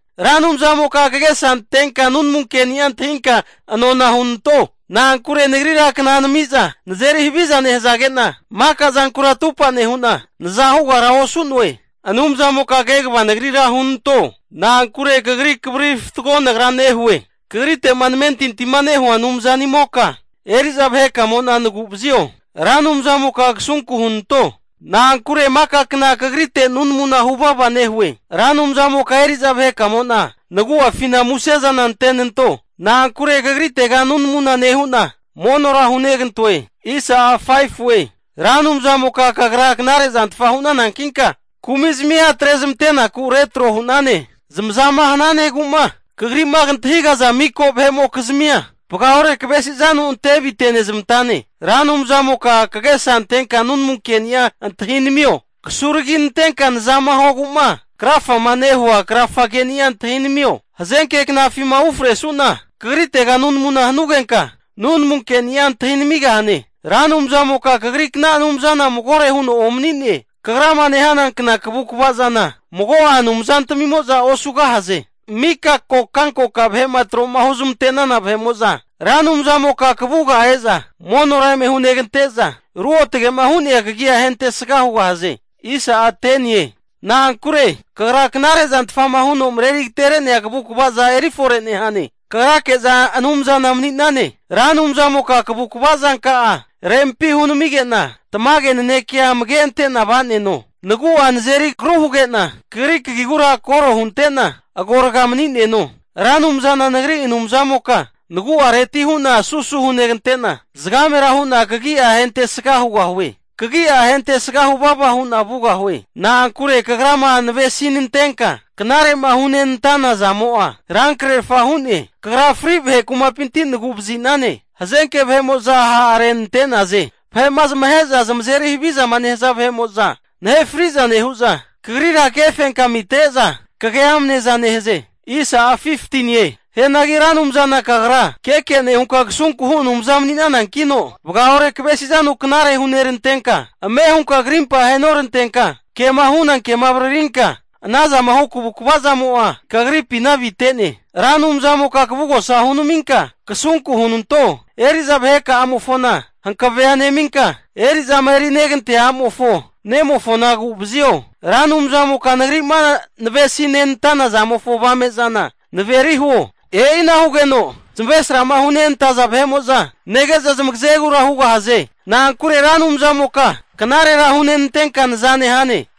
Ra Anumzamoka kagesa antenka nunamu keni'a antahinka nona hunanto. Na'ankure nagrira kna nami'za nazeri haviza nehazage'na, maka zankura atupa nehu'na, naza hugara osu'noe. Anumzamoka kegava nagrira hunanto. Na'ankure kagri kavariri fatgo nagra nehue. Kagrite'ma namentintima nehua Anumzanimoka eri'za vahekamo'na nagu'vazio. Ra Anumzamoka kasunku hunanto, na'ankure maka kna kagritega nunamuna huvava nehue. Ra Anumzamoka eri'za vahekamo'na nagu'afina muse'za antenanto, na'ankure kagritega nunamuna nehu'na monora hunegantoe. Ra Anumzamoka kagra knare'zantfa hu'nanankinka kumizmia atrezmante'naku retro hu'nane. Zamazama hananegu'ma kagri'ma kantahigaza miko vahe'mokizmia vagaore kavesizanu ante avite'nezmantane. Ra Anumzamoka kagesa antenka nunamu ke'ni'a antahinamio. Kasuraginantenka nazama huogu'ma krafama nehua krafageni'a antahinamio. Hazenke knafima ufresuna kagritega nunamuna hanugenka, nunamu keni'a antahinamigahane. Ra Anumzamoka kagrikna anumzana magore huno omani'ne. Kagrama nehana kna kagu'vazana mago'a anumzantmimo'za osugahaze. Mika kokankoka vahe'ma tro'ma huzmante'nana vahe'mo'za Ra Anumzamoka kavuga e'za monora eme hunegante'za ruotge'ma hu'nea kagia ahentesga hugahaze. Na'ankure kagra knarezantfa huno mareri agatere'nea kavu'kvaza erifore nehane. Kagrake'za Anumzana mani'nane. Ra Anumzamoka kavukva zanka'a rempi hunamige'na, tamage nanekeka'a amage antena va'neno. Nagu'a nazeri agru huge'na, kagri kagigura koro hunte'na agorga mani'neno. Ra Anumzana nagri Anumzamoka nagu'areti hu'na susu hunegante'na, zagamera hu'na kagia ahentesga hugahue. Kagi'a ahentesga huvava hu'na vugahue. Na'ankure Kagrama navesi'nantenka knare'ma hunenantana zamo'a rankrerfa hu'ne. Kagra fri vahe kumapinti nagu'vazi'nane. Hazenke vahe'mo'za ha'renantaze. Vahe'ma zamahe'za zamazeri havizama nehaza vahe'mo'za nahe fri'za nehu'za, Kagrira kagefenkami atre'za kage amneza nehaze. Hianagi Ra Anumzana kagra keke nehunka kasunku hu Anumza mani'nanankino, vagaore kavesizanu knare hunerantenka, ame hunka krimpa ahenorantenka, kema hu'nana kema avaririnka ana zama hu kavukva zamo'a kagripina avite'ne. Ra Anumzamoka kavugosa hunaminka, kasunku hunanto. Eri'za vaheka'amofona hankavea neminka, eri'zama erinegantea a'mofo nemofona agu'vazio. Ra Anumzamoka nagri'ma navesi nenantana zamofo avame'zana naveri huo. E'ina hugeno zamavaresrama hunentaza vahe'mo'za nege'za zamagazegura hugahaze. Na'ankure Ra Anumzamoka knarera hunenantenka naza nehane.